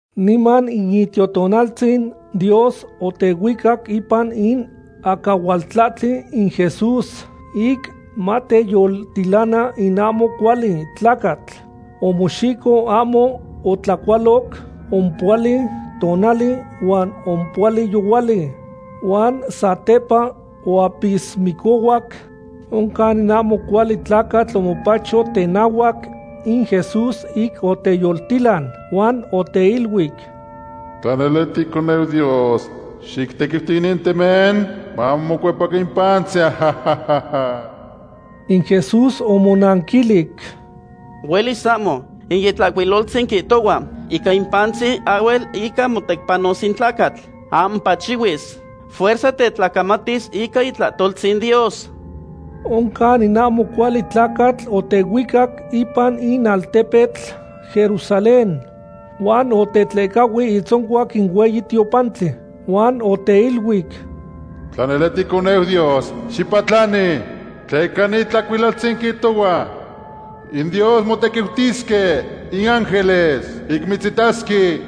Niman in Itiotonaltzin Dios otehuicac ipan in acahualtlahtli in Jesús, ic mateyoltilana in ahmo cuali tlacatl. Omoxico ahmo otlacualoc ompohuali tonali huan ompohuali yohuali, huan satepa oapismicohuac. Oncan in ahmo cuali tlacatl omopacho tenahuac in Jesús ic oteyoltilan, huan oteiluic: ―Tla nele ticoneu Dios, xictequiuti inin temen mamocuepacan in pantzin. In Jesús omonanquilic: ―¡Huelis ahmo! In Itlahcuiloltzin quihtohua: “Ica in pantzin ahhuel ica motecpanos in tlacatl. Ahmo pachihuis. Fuerza tetlacamatis ica itlahtoltzin Dios.” Oncan in ahmo cuali tlacatl otehuicac ipan in altepetl Jerusalén, huan otetlehcahui itzoncuac in hueyi tiopantli, huan oteiluic: ―Tla nele ticoneu Dios, xipatlani; tleca in Itlahcuiloltzin quihtohua: In Dios motequiutisque in ángeles ic mitzitasque.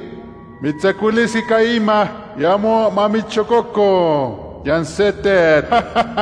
Mitztzacuilisque ica inman, ic ahmo mamitzxococo niyan se tetl.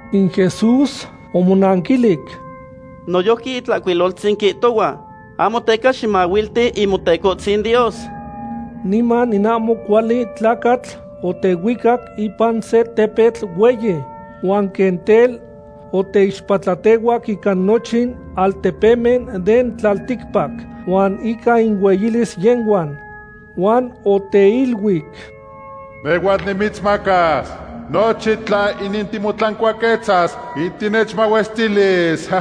In Jesús omonanquilic: ―Noyojqui in Itlahcuiloltzin quihtohua: “Ahmo teca ximahuilti in Motecohtzin Dios.” Niman in ahmo cuali tlacatl otehuicac ipan se tepetl hueyi, huan quen tel oteixpatlatehuac ica nochin altepemen den tlalticpac huan ica inueyilis yehhuan. Huan oteiluic: ―Nehhuatl nimitzmacas nochin inin tla timotlancuaquetzas ic tinechmahuestilis.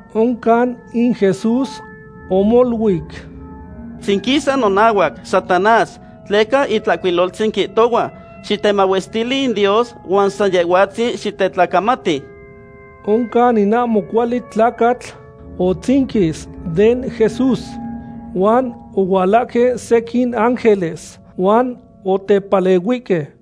Oncan in Jesús omoluic: ―Xitzinquisa nonahuac, Satanás, tleca in Itlahcuiloltzin quihtohua: “Xitemahuestili in Dios huan san Yehhuatzin xitetlacamati.” Oncan in ahmo cuali tlacatl otzinquis den Jesús, huan ohualahque sequin ángeles huan otepalehuihque.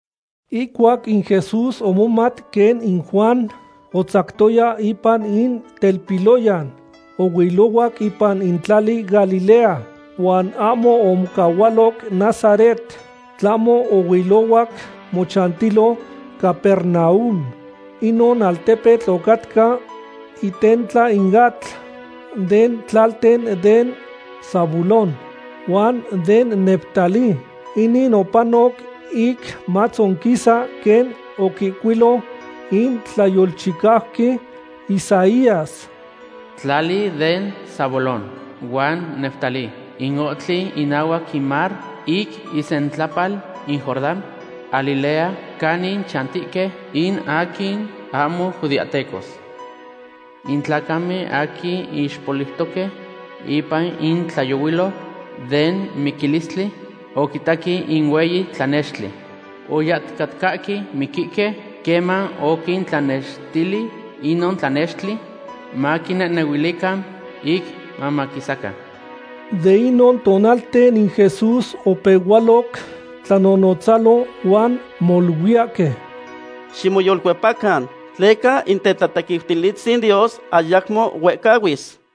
Ihcuac in Jesús omomat quen in Juan otzactoya ipan in telpiloyan, ohuilohuac ipan in tlali Galilea. Huan ahmo omocahualoc Nazaret, tlahmo ohuilohuac mochantilo Capernaum. Inon altepetl ocatca itentla in atl, den tlalten den Zabulón huan den Neftalí. Inin opanoc ic matzonquisa quen oquihcuilo in tlayolchicauqui Isaías: Tlali den Zabulón huan Neftalí, in ohtli inahuac in mar, ic isentlapal in Jordán; Galilea, canin chantihque in aquin ahmo judeahtecos. In tlacamen aquin ixpoliutoque ipan in tlayohuilotl den miquilistli oquitaque in hueyi tlanextli. Oyahticatcahque miquihque queman oquintlanextili inon tlanextli, maquinehnehuilican ic mamaquisacan. De inon tonalten in Jesús opehualoc tlanonotzalo huan moluiyahque: ―Ximoyolcuepacan, tleca in tetlatequiutilistzin Dios ayacmo huehcahuis.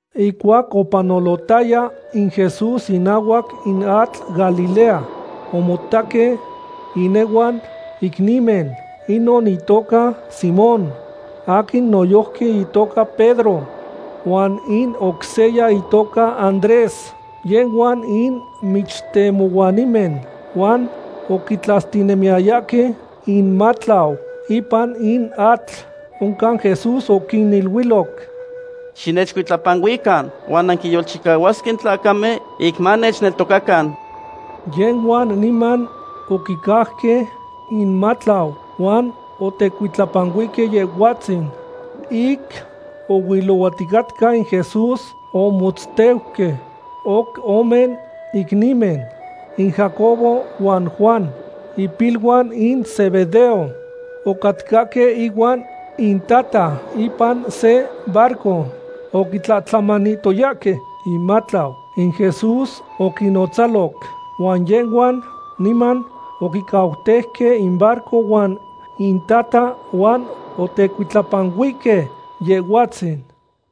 Ihcuac opanolotaya in Jesús inahuac in atl Galilea, omotaque inehuan icnimen; inon itoca Simón, aquin noyojqui itoca Pedro, huan in oc seya itoca Andrés. Yehhuan in michtemohuanimen huan oquitlastinemiyayahque inmatlau ipan in atl. Oncan Jesús oquiniluiloc: ―Xinechcuitlapanuican huan nanquinyolchicahuasque in tlacamen ic manechneltocacan. Yehhuan niman oquicauque inmatlau huan otecuitlapanuihque Yehhuatzin. Ic ohuilohuaticatca in Jesús omotzteuque oc ome icnimen, in Jacobo huan Juan, ipiluan in Zebedeo. Ocatcahque ihuan intata ipan se barco oquitlatlamanihtoyahque inmatlau. In Jesús oquinnotzaloc, huan yehhuan niman oquicauteuque in barco huan intata, huan otecuitlapanuihque Yehhuatzin.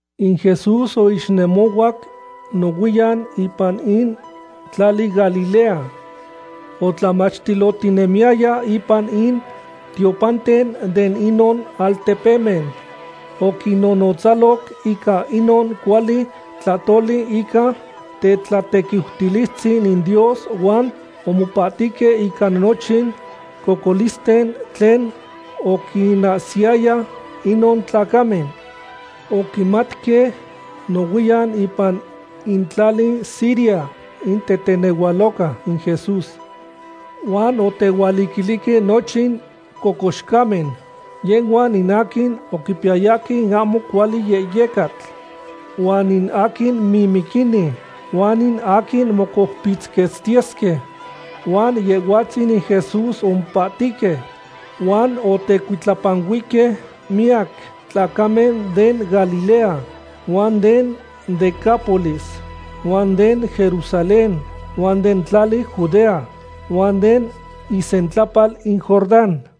In Jesús oixnemohuac nohuiyan ipan in tlali Galilea, otlamachtilotinemiyaya ipan in tiopanten de inon altepemen. Oquinnonotzaloc ica inon cuali tlahtoli ica tetlatequiutilistzin in Dios huan omopahtihque ica nochin cocolisten tlen oquinahsiyaya inon tlacamen. Oquimatque nohuiyan ipan in tlali Siria in tetenehualoca in Jesús, huan otehualiquilihque nochin cocoxcamen, yehhuan in aquin oquipiyayahque in ahmo cuali yehyecatl, huan in aquin mimiquini, huan in aquin mocoupitzquetztiyesque. Huan Yehhuatzin in Jesús omopahtihque. Huan otecuitlapanuihque miyac tlacamen den Galilea, huan den Decápolis, huan den Jerusalén, huan den tlali Judea, huan den isentlapal in Jordán.